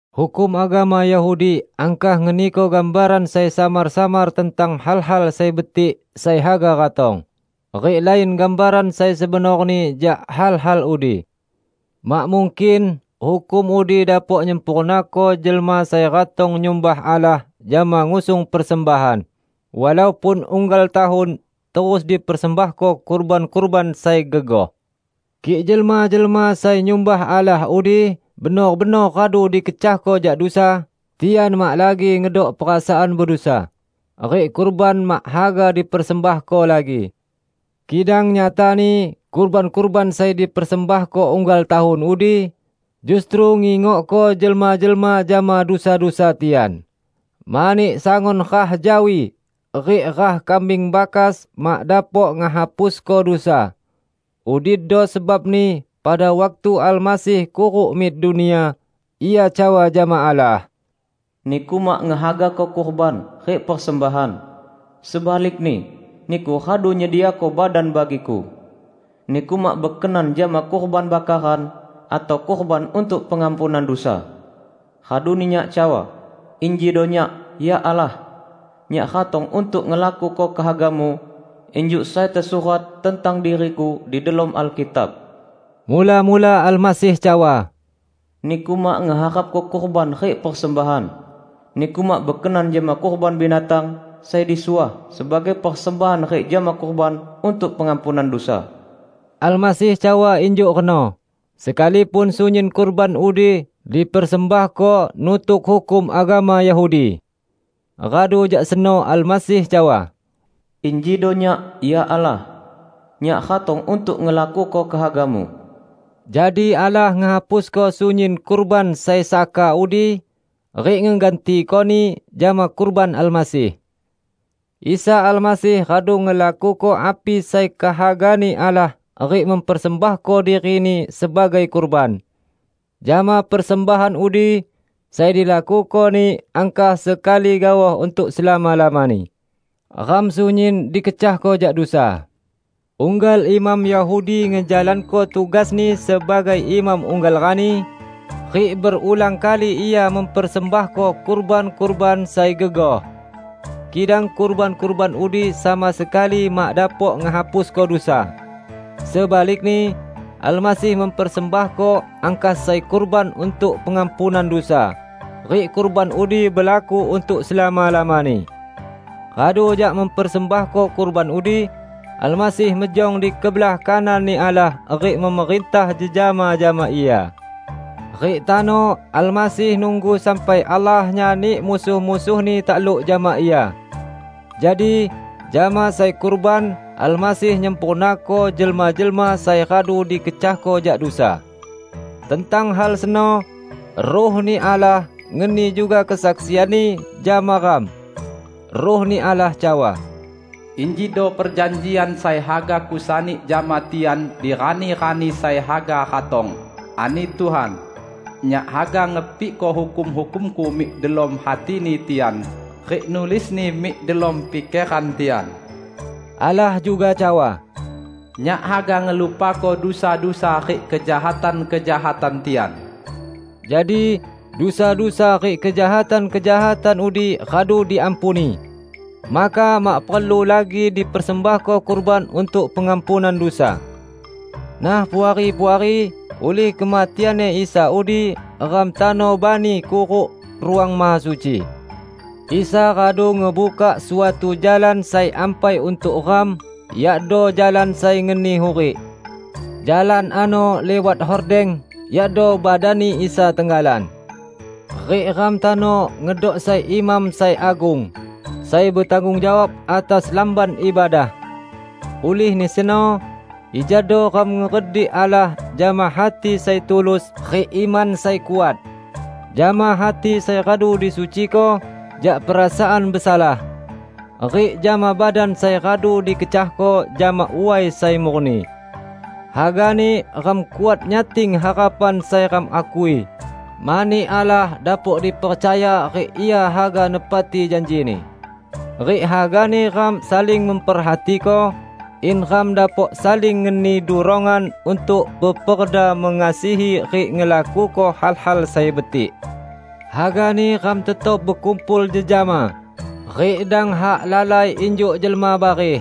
Hukum agama Yahudi angkah ngeniko gambaran sai samar-samar tentang hal-hal sai betik sai haga ratong, rik lain gambaran sai sebenorni jak hal-hal udi. Mak mungkin hukum udi dapok nyempurnako jelma sai ratong nyumbah Allah jama ngusung persembahan, walaupun unggal tahun terus dipersembahko kurban-kurban sai gegoh. Kik jelma-jelma sai nyumbah Allah udi benor-benor radu dikecahko jak dusa, tian mak lagi ngedok perasaan bedusa, rik kurban mak haga dipersembahko lagi. Kidang nyatani kurban-kurban sai dipersembahko unggal tahun udi justru ngingokko jelma-jelma jama dusa-dusa tian, mani sangun rah jawi rik rah kambing bakas mak dapok ngehapusko dusa. Udido sebabni pada waktu Almasih kuruk mik dunia, Ia cawa jama Allah, "Niku mak ngehagako kurban rik persembahan; sebalikni Niku radu nyediako badan bagi-Ku. Niku mak bekenan jama kurban bakaran atau kurban untuk pengampunan dusa. Raduni Nyak cawa, 'Injido Nyak, ya Allah! Nyak ratong untuk ngelakuko kehaga-Mu, injuk sai tesurat tentang diri-Ku di delom Alkitab.' " Mula-mula Almasih cawa, "Niku mak ngeharapko kurban rik persembahan; Niku mak bekenan jama kurban binatang sai disuah sebagai persembahan rik jama kurban untuk pengampunan dusa." Almasih cawa injuk reno, sekalipun sunyin kurban udi dipersembahko nutuk hukum agama Yahudi. Radu jak seno Almasih cawa, "Injido Nyak, ya Allah! Nyak ratong untuk ngelakuko kehaga-Mu." Jadi Allah ngehapusko sunyin kurban sai saka udi, rik ngegantikoni jama kurban Almasih. Isa Almasih radu ngelakuko api sai kehaga-Ni Allah rik mempersembahko diri-Ni sebagai kurban. Jama persembahan udi, sai dilakuko-Ni angkah sekali gaoh untuk selama-lamani, ram sunyin dikecahko jak dusa. Unggal imam Yahudi ngejalanko tugasni sebagai imam unggal rani, rik berulang kali ia mempersembahko kurban-kurban sai gegoh. Kidang kurban-kurban udi sama sekali mak dapok ngehapusko dusa. Sebalikni, Almasih mempersembahko angkah sai kurban untuk pengampunan dusa, rik kurban udi belaku untuk selama-lamani. Radu jak mempersembahko kurban udi, Almasih mejong di kebelah kanan-Ni Allah rik memerintah jejama jama Ia. Rik tano Almasih nunggu sampai Allah nyani musuh-musuh-Ni takluk jama Ia. Jadi, jama sai kurban, Almasih nyempurnako jelma-jelma sai radu dikecahko jak dusa. Tentang hal seno Ruh-Ni Allah ngeni juga kesaksian-Ni jama ram. Ruh-Ni Allah cawa, " 'Injido perjanjian sai haga Kusani jama tian di rani-rani sai haga ratong,' ani Tuhan, 'Nyak haga ngepikko hukum-hukum-Ku mik delom hatini tian, rik nulisni mik delom pikeran tian.' " Allah juga cawa, "Nyak haga ngelupako dusa-dusa rik kejahatan-kejahatan tian." Jadi, dusa-dusa rik kejahatan-kejahatan udi radu diampuni, maka mak perlu lagi dipersembahko kurban untuk pengampunan dusa. Nah, Puari-puari, ulih kematian-Ni Isa udi ram tano bani kuruk Ruang Mahasuci. Isa radu ngebukak suatu jalan sai ampai untuk ram, yakdo jalan sai ngeni hurik. Jalan ano liwat hordeng, yakdo badan-Ni Isa tenggalan. Rik ram tano ngedok sai imam sai agung, sai betanggung jawab atas Lamban Ibadah. Ulihni seno, ijado ram ngeredik Allah jama hati sai tulus rik iman sai kuat; jama hati sai radu disuciko jak perasaan besalah, rik jama badan sai radu dikecahko jama way sai murni. Hagani ram kuat nyating harapan sai ram akui, mani Allah dapok dipercaya rik Ia haga nepati janji-Ni. Rik hagani ram saling memperhatiko, in ram dapok saling ngeni durongan untuk peperda mengasihi rik ngelakuko hal-hal sai betik. Hagani ram tetap bekumpul jejama, rik dang hak lalai injuk jelma bareh.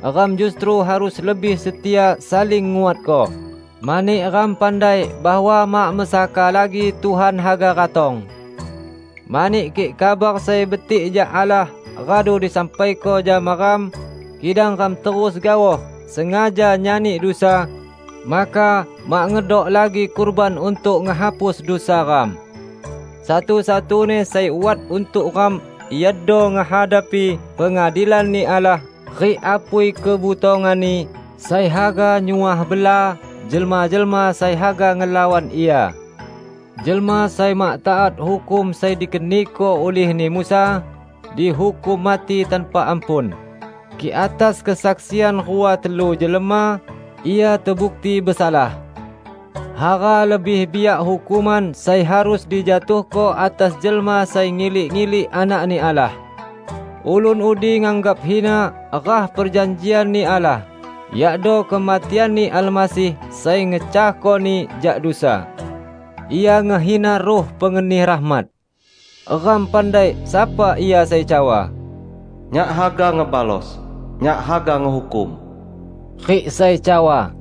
Ram justru harus lebih setia saling nguatko, mani ram pandai bahwa mak mesaka lagi Tuhan haga ratong. Mani kik kabar sai betik jak Allah radu disampaiko jama ram, kidang ram terus gaoh sengaja nyani dusa, maka mak ngedok lagi kurban untuk ngehapus dusa ram. Satu-satuni sai wat untuk ram iado ngehadapi pengadilan-Ni Allah rik apui kebutongan-Ni sai haga nyuah bela jelma-jelma sai haga ngelawan Ia! Jelma sai mak taat hukum sai dikeniko ulihni Musa, dihukum mati tanpa ampun, kik atas kesaksian rua telu jelma, ia tebukti besalah. Hara lebih biak hukuman sai harus dijatuhko atas jelma sai ngilik-ilik Anak-Ni Allah. Ulun udi nganggap hina rah perjanjian-Ni Allah, yakdo kematian-Ni Almasih sai ngecahkoni jak dusa. Ia ngehina Ruh pengeni rahmat. Ram pandai sapa Ia sai cawa, "Nyak haga ngebalos! Nyak haga ngehukum!" rik sai cawa,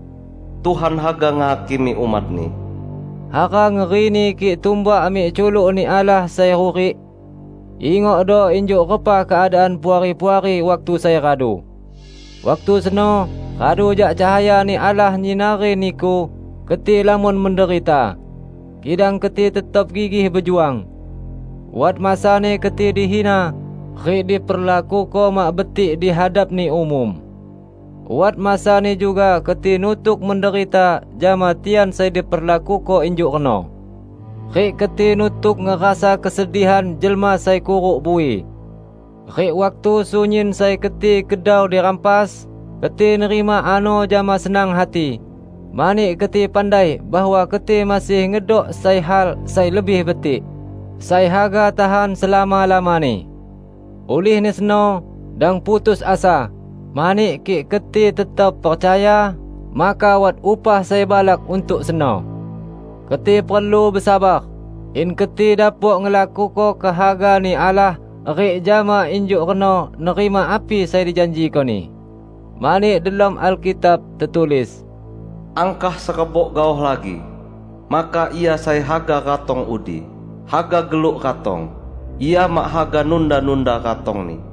"Tuhan haga ngehakimi umat-Ni." Hara ngerini kik tumbak mik culuk-Ni Allah Sai Hurik! Ingokdo injuk repa keadaan Puari-puari waktu sai radu. Waktu seno, radu jak cahaya-Ni Allah nyinari niku, keti lamon menderita; kidang keti tetap gigih bejuang. Wat masani keti dihina rik diperlakuko mak betik di hadapni umum. Wat masani juga keti nutuk menderita jama tian sai diperlakuko injuk reno, rik keti nutuk ngerasa kesedihan jelma sai kuruk bui. Rik waktu sunyin sai keti kedau dirampas, keti nerima ano jama senang hati, mani keti pandai bahwa keti masih ngedok sai hal sai lebih betik, sai haga tahan selama-lamani. Ulihni seno, dang putus asa, mani kik keti tetap percaya, maka wat upah sai balak untuk seno! Keti perlu besabar, in keti dapok ngelakuko kehaga-Ni Allah rik jama injuk reno nerima api sai dijanjiko-Ni. Mani delom Alkitab tetulis, "Angkah serebok gaoh lagi, maka Ia sai haga ratong udi, haga geluk ratong; Ia mak haga nunda-nunda ratong-Ni.